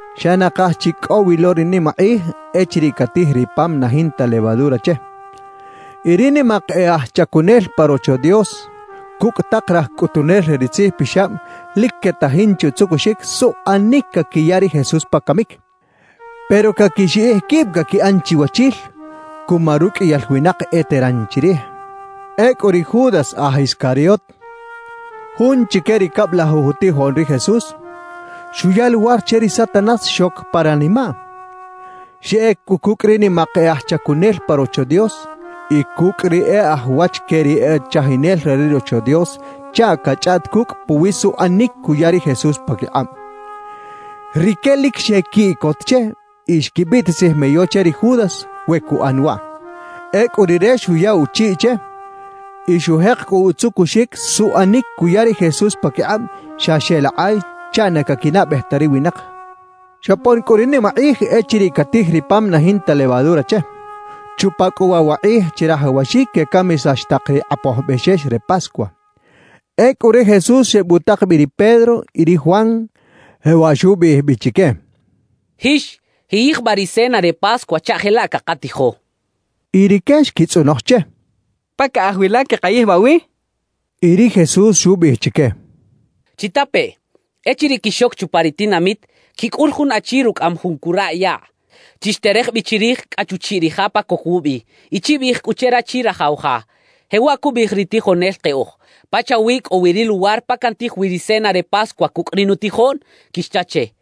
Xa nakaj chi cꞌo wi lo ri nimakꞌij echiriꞌ catij ri pam na jinta levadura che. Y ri nimak e aj chacunel pa Rocho Dios cucꞌ tak raj cꞌutunel re ri tzijpixab lic quetajin che utzucuxic suꞌanic caquiya ri Jesús pa camic, pero caquixiꞌij quib caquiꞌan chiwachil cuma ruqꞌuiyal winak eteran chirij. Ecꞌu ri Judas aj Iscariot, jun chique ri cablajuj utijoꞌn ri Jesús, xuya luwar che ri Satanás xoc pa ranimaꞌ. Xeꞌec cꞌu cucꞌ ri nimak e aj chacunel pa Rocho Dios y cucꞌ ri e aj wach que ri e chajinel re ri Rocho Dios chaꞌ cachꞌaꞌt cucꞌ puwiꞌ suꞌanic cuya ri Jesús paquikꞌab. Rique lic xequiꞌcot che y xquibiꞌtisij meyo che ri Judas we cuꞌan waꞌ. Ecꞌu rire xuya uchiꞌ che y xujek cꞌu utzucuxic suꞌanic cuya ri Jesús paquikꞌab xa xeꞌlakꞌay chaꞌ na caquinaꞌbej ta ri winak. Xopon cꞌu ri nimakꞌij echiriꞌ catij ri pam na jinta levadura che. Chupa cꞌu waꞌ wa kꞌij chirajawaxic quecamisax tak ri kꞌapoj bexex re Pascua. Ecꞌu ri Jesús xebutak bi ri Pedro y ri Juan, jewaꞌ xubiꞌij bi chique: —Jix, jiꞌyijbaꞌ ri cena re Pascua chaꞌ jelaꞌ cakatijo —xchaꞌ. Y rique xquitzꞌonoj che: —¿Pa caꞌaj wi la queꞌkayijbaꞌ wi? —xechaꞌ. Y ri Jesús xubiꞌij chique: —Chitapeꞌ: Echiriꞌ quixoc chupa ri tinamit, quicꞌul jun achi rucꞌaꞌam jun curaꞌ yaꞌ. Chixterej bi chirij cꞌa chuchiꞌ ri ja pa coc wubi y chibiꞌij cꞌu che rachi rajaw ja: “Jewaꞌ cubiꞌij ri tijonel keꞌoj: ¿Pachawi cꞌo wi ri luwar pa cantij wi ri cena re Pascua cucꞌ ri nutijoꞌn?” quixcha che.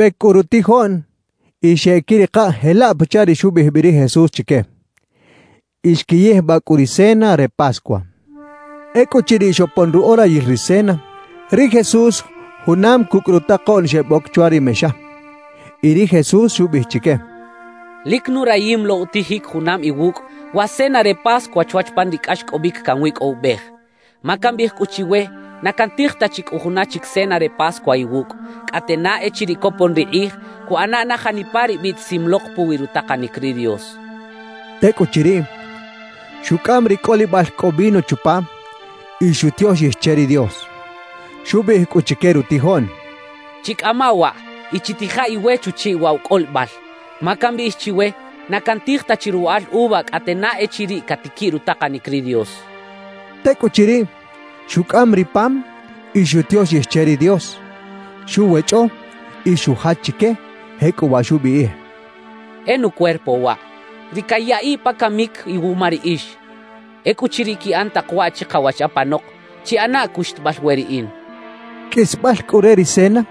Xebec cꞌu rutijoꞌn y xeꞌquirikaꞌ jelaꞌ pachaꞌ ri xubiꞌij bi ri Jesús chique. Y xquiyijbaꞌ cꞌu ri cena re Pascua. Ecꞌuchiriꞌ xopon ruꞌorayil ri cena, ri Jesús junam cucꞌ rutakoꞌn xeboc chwa ri mexa. Y ri Jesús xubiꞌij chique: —¡Lic nurayim lo utijic junam iwucꞌ wa cena re Pascua chwach pan ri cꞌaxcꞌobic canwicꞌowibej! Ma cambiꞌij cꞌu chiwe na cantij ta chi cꞌu juna chic cena re Pascua iwucꞌ, cꞌate na echiriꞌ copon ri kꞌij cuꞌana na janipa ri biꞌtisim lok puwi rutakanic ri Dios —xchaꞌ. Tecꞌuchiriꞌ, xucꞌam ri cꞌolibal cꞌo vino chupa y xutioxij che ri Dios. Xubiꞌij cꞌu chique rutijoꞌn: —Chicꞌama waꞌ y chitija iwe chuchiꞌ waꞌ wa cꞌolibal. Ma cambiꞌij chiwe: Na cantij ta chi ruwaꞌal uva cꞌate na echiriꞌ catiquiꞌ rutakanic ri Dios —xchaꞌ. Tecꞌuchiriꞌ, xucꞌam ri pam y xutioxij che ri Dios. Xuwechꞌo y xujach chique, jecꞌuwaꞌ xubiꞌij: —E nucuerpo waꞌ, ri cayaꞌiꞌ pa camic iwuma riꞌix. Ecꞌuchiriꞌ quiꞌan tak waꞌ chikawach apanok, chiꞌanaꞌ cuxtabal we riꞌin —xchaꞌ. Qꞌuisbal cꞌu re ri cena,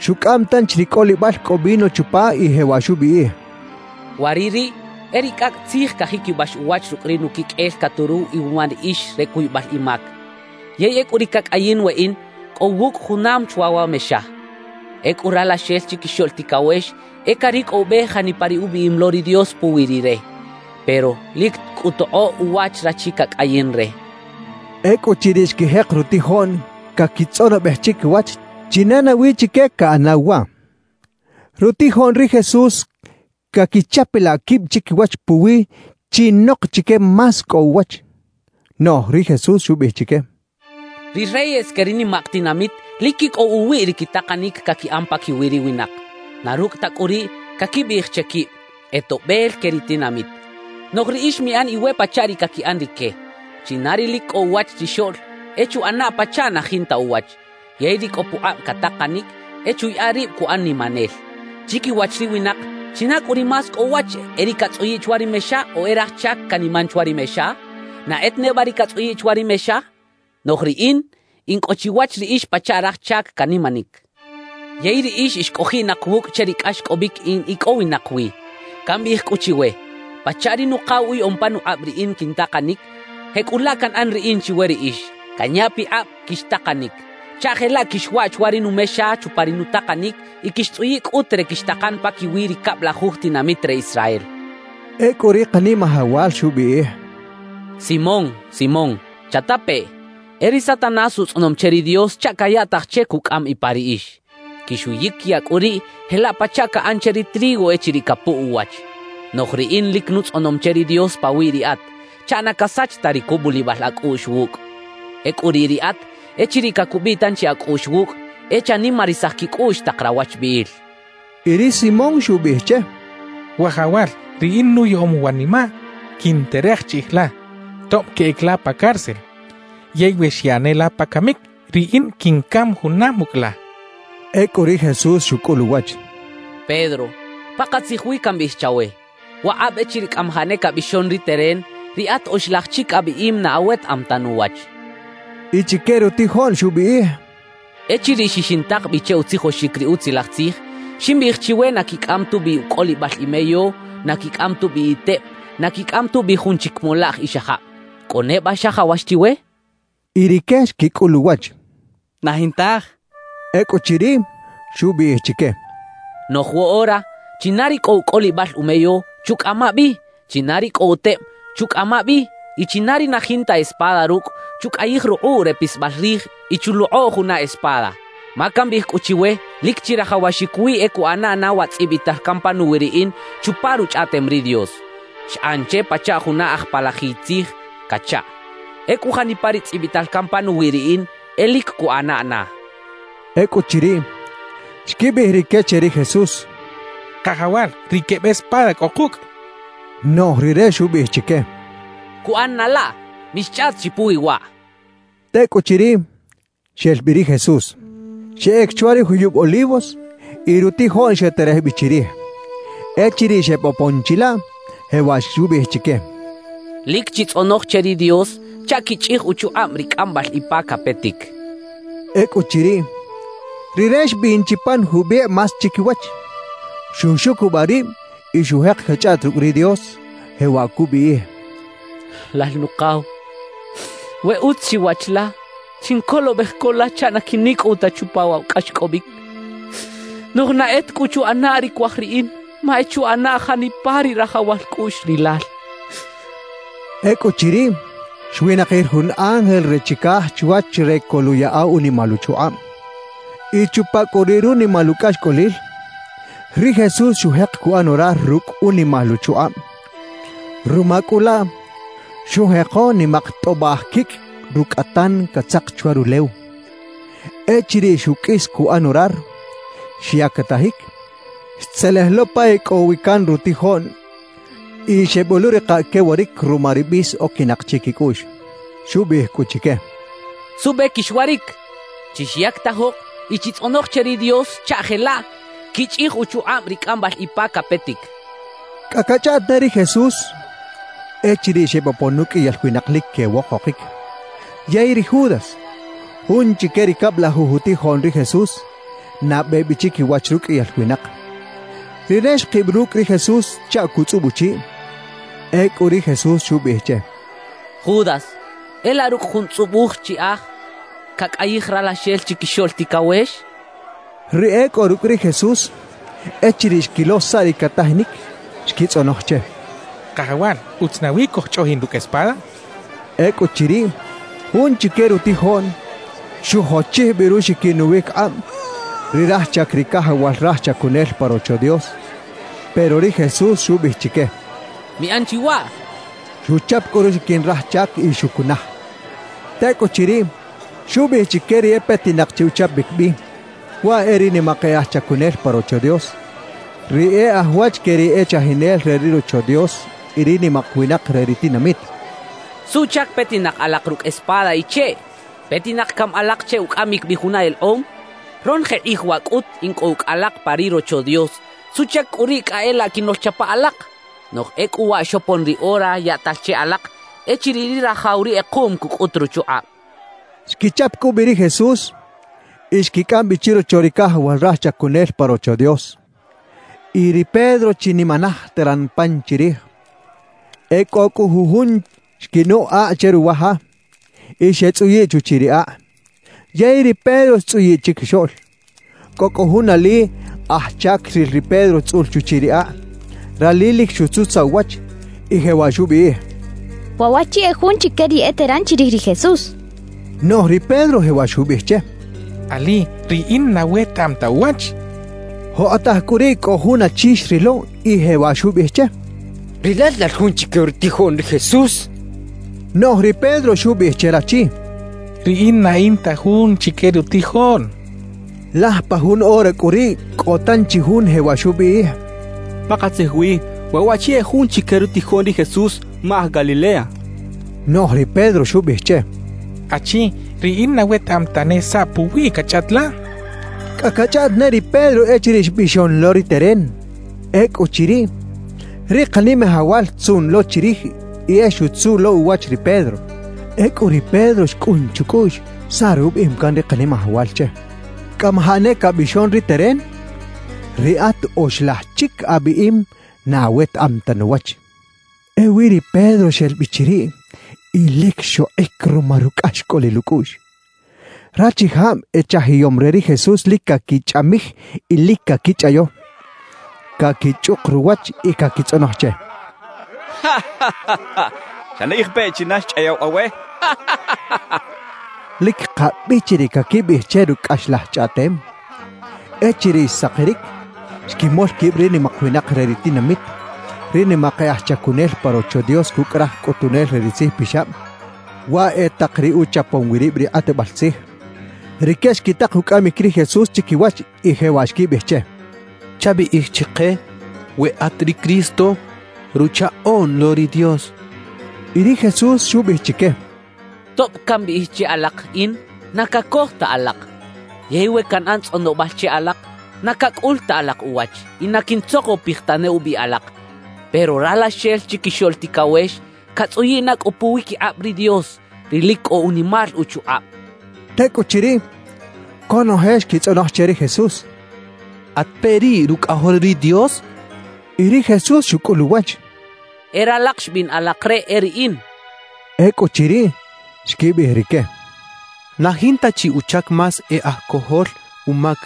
xucꞌam tanchi ri cꞌolibal cꞌo vino chupa y jewaꞌ xubiꞌij: —Waꞌ ri riꞌ e ri cꞌacꞌ tzij cajiquibax uwach rucꞌ ri nuquiqꞌuel caturuw iwuma riꞌix re cuybal imac. Yey ecꞌu ri cacꞌayin weꞌin, cꞌo wucꞌ junam chwa wa mexa. Ecꞌu Ralaxel Chiquixoꞌl Ticawex e caricꞌowibej janipa ri ubiꞌim lo ri Dios puwi Rire. Pero ¡lic cꞌu tokꞌoꞌ uwach rachi cacꞌayin re! —xchaꞌ. Ecꞌuchiriꞌ xquijek rutijoꞌn caquitzꞌonobej chiquiwach china nawi chique caꞌanaw waꞌ. Rutijoꞌn ri Jesús caquichapalaꞌ quib chiquiwach puwiꞌ chinok chique más cꞌo uwach. Noꞌj ri Jesús xubiꞌij chique: «Ri reyes que ri nimak tinamit lic quicꞌow uwiꞌ ri quitakanic caquiꞌan paquiwi ri winak. Na rucꞌ ta cꞌu riꞌ, caquibiꞌij che quib: “E toꞌbel que ri tinamit.” »Noꞌj riꞌix miꞌan iwe pachaꞌ ri caquiꞌan rique. China ri lic cꞌo uwach chixoꞌl, e chuꞌana pachaꞌ na jinta uwach; yey ri cꞌo pukꞌab catakanic, e chuyaꞌa rib cuꞌan nimanel. »Chiquiwach ri winak, ¿china cꞌu ri más cꞌo uwach, e ri catzꞌuyiꞌ chwa ri mexa o e raj chac caniman chwa ri mexa? ¿Na e ta neba ri catzꞌuyiꞌ chwa ri mexa? Noꞌj riꞌin in cꞌo chiwach riꞌix pachaꞌ raj chac canimanic. Yey riꞌix ix cꞌojiꞌnak wucꞌ che ri cꞌaxcꞌobic in icꞌowinak wi. »Cambiꞌij cꞌu chiwe: Pachaꞌ ri Nukaw uyaꞌom panukꞌab riꞌin quintakanic, jecꞌulaꞌ canꞌan riꞌin chiwe riꞌix, canya pikꞌab quixtakanic chaꞌ jelaꞌ quixwaꞌ chwa ri numexa chupa ri nutakanic y quixtzꞌuyiꞌ cꞌut re quixtakan paquiwi ri cablajuj tinamit re Israel» xchaꞌ. Ecꞌu ri Kanimajawal xubiꞌij: —¡Simón, Simón, chatapeꞌ! E ri Satanás utzꞌonom che ri Dios chaꞌ cayaꞌtaj che cucꞌam ipa riꞌix. Quixuyiquiyaꞌ cꞌu riꞌ jelaꞌ pachaꞌ caꞌan che ri trigo echiriꞌ capuꞌ uwach. Noꞌj riꞌin lic nutzꞌonom che ri Dios pawiꞌ riꞌat, chaꞌ na casach ta ri cubulibal acꞌuꞌx wucꞌ. Ecꞌu riꞌ riꞌat, echiriꞌ cacubiꞌ tanchi acꞌuꞌx wucꞌ, e chanimarisaj quicꞌuꞌx tak rawachbiꞌil —xchaꞌ. Y ri Simón xubiꞌij che: —Wajawal, riꞌin nuyaꞌom wanimaꞌ quinterej chiꞌij la, tob queꞌec la pa cárcel; yey we xyaꞌ ne la pa camic, riꞌin quincam junam ucꞌ la —xchaꞌ. Ecꞌu ri Jesús xucꞌul uwach: —Pedro, pakatzij wi cambiꞌij chawe: Wakꞌab echiriꞌ cꞌamajaꞌ ne cabixon ri teren, riꞌat oxlaj chic abiꞌim na awetaꞌam ta nuwach —xchaꞌ. Y chique rutijoꞌn xubiꞌij: —Echiriꞌ xixintak bi che utzijoxic ri Utzilaj Tzij, ximbiꞌij chiwe na quicꞌam tubi ucꞌolibal imeyo, na quicꞌam tubi iteb, na quicꞌam tubi jun chic molaꞌj ixajab, ¿cꞌo neba xajawax chiwe? —xcha chique. Y rique xquicꞌul uwach: —Na jintaj —xechaꞌ. Ecꞌuchiriꞌ, xubiꞌij chique: —Noꞌj woꞌora, china ri cꞌo ucꞌolibal umeyo, chucꞌama bi; china ri cꞌo uteb, chucꞌama bi; y china ri na jinta espada rucꞌ, chucꞌayij rukꞌuꞌ re pisbal rij y chulokꞌo juna espada. Ma cambiꞌij cꞌu chiwe lic chirajawaxic wi e cuꞌana na wa tzꞌibital can panuwi riꞌin chupa Ruchꞌaꞌtem ri Dios: Xꞌan che pachaꞌ juna aj palajiy tzij cachaꞌ. Ecꞌu janipa ri tzꞌibital can panuwi riꞌin, e lic cuꞌana na —xchaꞌ. Ecꞌuchiriꞌ, xquibiꞌij rique che ri Jesús: —Kajawal, riꞌ queb espada cꞌo kucꞌ —xechaꞌ. Noꞌj rire xubiꞌij chique: —¡Cuꞌan na laꞌ! Mixchꞌaꞌt chi puwi waꞌ —xchaꞌ. Tecꞌuchiriꞌ, xel bi ri Jesús. Xeꞌec chwa ri juyub Olivos, y rutijoꞌn xeterej bi chirij. Echiriꞌ xebopon chilaꞌ, jewaꞌ xubiꞌij chique: —Lic chitzꞌonoj che ri Dios chaꞌ quichꞌij uchukꞌab ri cꞌambal ipa capetic —xchaꞌ. Ecꞌuchiriꞌ, rire xbin chi pan jubikꞌ más chiquiwach, xuxucubaꞌ rib y xujek cachꞌaꞌt rucꞌ ri Dios, jewaꞌ cubiꞌij: «Lal Nukaw, we utz chiwach la, chincolobej co la chaꞌ na quinicꞌow ta chupa waꞌ wa cꞌaxcꞌobic. Noꞌj na e ta cꞌu chuꞌana ri cuaj riꞌin, ma e chuꞌana janipa ri rajawal cꞌuꞌx Rilal» xchaꞌ. Ecꞌuchiriꞌ, xwinakir jun ángel re chicaj chwach re coluꞌyaꞌa unimal uchukꞌab. Y chupa cꞌu riꞌ runimal ucꞌaxcꞌolil, ri Jesús xujek cuꞌan orar rucꞌ unimal uchukꞌab. Ruma cꞌu laꞌ xujeko nimak tꞌobaꞌj quicꞌ rucꞌatan catzak chwa rulew. Echiriꞌ xuqꞌuis cuꞌan orar, xyactajic, xtzelej lo pa e cꞌo wi can rutijoꞌn y xeboꞌluꞌrikaꞌ quewaric ruma ri bis oquinak chiquicꞌuꞌx. Xubiꞌij cꞌu chique: —¿Suꞌbe quixwaric? Chixyactajok y chitzꞌonoj che ri Dios chaꞌ jelaꞌ quichꞌij uchukꞌab ri cꞌambal ipa capetic —xchaꞌ. Cꞌa cachꞌaꞌt ne ri Jesús, echiriꞌ xebopon uqꞌuiyal winak lic quewokokic. Yey ri Judas, jun chique ri cablajuj utijoꞌn ri Jesús, nabe bi chiquiwach ruqꞌuiyal winak. Rire xkib rucꞌ ri Jesús chaꞌ cutzꞌub uchiꞌ. Ecꞌu ri Jesús xubiꞌij che: —Judas, ¿e laꞌ rucꞌ jun tzꞌubuj chiꞌaj cacꞌayij Ralaxel Chiquixoꞌl Ticawex? —xchaꞌ. Ri e cꞌo rucꞌ ri Jesús, echiriꞌ xquilo saꞌ ri catajinic, xquitzꞌonoj che: —Kajawal, ¿utz nawi cojchꞌoꞌjin rucꞌ espada? —xechaꞌ. Ecꞌuchiriꞌ, jun chique rutijoꞌn xujochij bi ruxiquin uwiquikꞌab ri raj chac ri cajawal raj chacunel pa Rocho Dios. Pero ri Jesús xubiꞌij chique: —¡Miꞌan chi waꞌ! —xchaꞌ. Xuchap cꞌu ruxiquin raj chac y xucunaj. Tecꞌuchiriꞌ, xubiꞌij chique ri e petinak che uchapic bi, waꞌ e ri nimak e aj chacunel pa Rocho Dios, ri e aj wach que ri e chajinel re ri Rocho Dios y ri nimak winak re ri tinamit: —¿Suꞌchac petinak alak rucꞌ espada y cheꞌ? ¿Petinak cami alak che ucꞌamic bi juna elekꞌom? Ronoje kꞌij waꞌ cꞌut in cꞌo ucꞌ alak pa ri Rocho Dios. ¿Suꞌchac cꞌu riꞌ cꞌa e laꞌ quinoꞌlchapa alak? Noꞌj ecꞌu waꞌ xopon ri ora yaꞌtal che alak echiriꞌ ri rajaw ri kꞌekuꞌm cucꞌut ruchukꞌab —xchaꞌ. Xquichap cꞌu bi ri Jesús y xquicꞌam bi chirocho ri cajawal raj chacunel pa Rocho Dios. Y ri Pedro chinimanaj teran pan chirij. E cꞌo cꞌu jujun xquinucꞌ akꞌ che ruwa ja, y xetzꞌuyiꞌ chuchiꞌ ri akꞌ. Yey ri Pedro xtzꞌuyiꞌ chiquixoꞌl. Cꞌo cꞌu jun ali aj chac xril ri Pedro tzꞌul chuchiꞌ ri akꞌ. Rali lic xutzutzaꞌ uwach y jewaꞌ xubiꞌij: —Waꞌ waꞌchi e jun chique ri eteran chirij ri Jesús —xchaꞌ. Noꞌj ri Pedro jewaꞌ xubiꞌij che: —Ali, riꞌin na wetaꞌam ta uwach —xchaꞌ. Jokꞌotaj cꞌu riꞌ cꞌo jun achi xrilo y jewaꞌ xubiꞌij che: —Rilal lal jun chique rutijoꞌn ri Jesús —xchaꞌ. Noꞌj ri Pedro xubiꞌij che rachi: —Riꞌin na in ta jun chique rutijoꞌn —xchaꞌ. Laj pa jun ora cꞌu riꞌ cꞌo tanchi jun jewaꞌ xubiꞌij: —Pakatzij wi waꞌ waꞌchi e jun chique rutijoꞌn ri Jesús, ma aj Galilea —xchaꞌ. Noꞌj ri Pedro xubiꞌij che: —Achi, riꞌin na wetaꞌam tane saꞌ puwiꞌ cachꞌaꞌt la —xchaꞌ. Cꞌa cachꞌaꞌt ne ri Pedro echiriꞌ xbixon lo ri teren. Ecꞌuchiriꞌ, ri Kanimajawal xtzuꞌn lo chirij y e xutzuꞌ lo uwach ri Pedro. Ecꞌu ri Pedro xcꞌun chucꞌuꞌx saꞌ rubiꞌim can ri Kanimajawal che: «Cꞌamajaꞌ ne cabixon ri teren, riꞌat oxlaj chic abiꞌim na awetaꞌam ta nuwach.» Ewi ri Pedro xel bi chiriꞌ y lic xokꞌic ruma rucꞌaxcꞌolil ucꞌuꞌx. Rachijab echajiyom re ri Jesús lic caquichꞌamij y lic caquichꞌayo. Caquichꞌuk ruwach y caquitzꞌonoj che: —¡Chanaꞌij peꞌ china xchꞌayaw awe! —quechaꞌ. Lic kabichi ri caquibiꞌij che rucꞌ cꞌaxlaj chꞌaꞌtem. Echiriꞌ xsakiric, xquimol quib ri nimak winak re ri tinamit, ri nimak e aj chacunel pa Rocho Dios cucꞌ raj cꞌutunel re ri tzijpixab; waꞌ e tak ri uchapom wi rib ri kꞌatbal tzij. Rique xquitak ucꞌamic ri Jesús chiquiwach y jewaꞌ xquibiꞌij che: —Chabiꞌij chike we at ri Cristo, Ruchaꞌoꞌn lo ri Dios —xechaꞌ. Y ri Jesús xubiꞌij chique: —Tob cambiꞌij che alak “In”, na cacoj ta alak. Yey we canꞌan tzꞌonobal che alak, na cacꞌul ta alak uwach y na quintzokopij tane ubi alak. Pero Ralaxel Chiquixoꞌl Ticawex catzꞌuyiꞌ na cꞌu puwiquikꞌab ri Dios, ri lic cꞌo unimal uchukꞌab —xchaꞌ. Tecꞌuchiriꞌ, conoje xquitzꞌonoj che ri Jesús: —¿At peꞌ riꞌ Rucꞌajol ri Dios? —xecha che. Y ri Jesús xucꞌul uwach: —E ralak xbiꞌn alak re, e riꞌin —xchaꞌ. Ecꞌuchiriꞌ, xquibiꞌij rique: —Na jinta chi uchac más e aj cojol umac,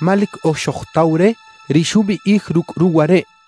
ma lic oj xojtaw re ri xubiꞌij rucꞌ ruwa reꞌ —xechaꞌ.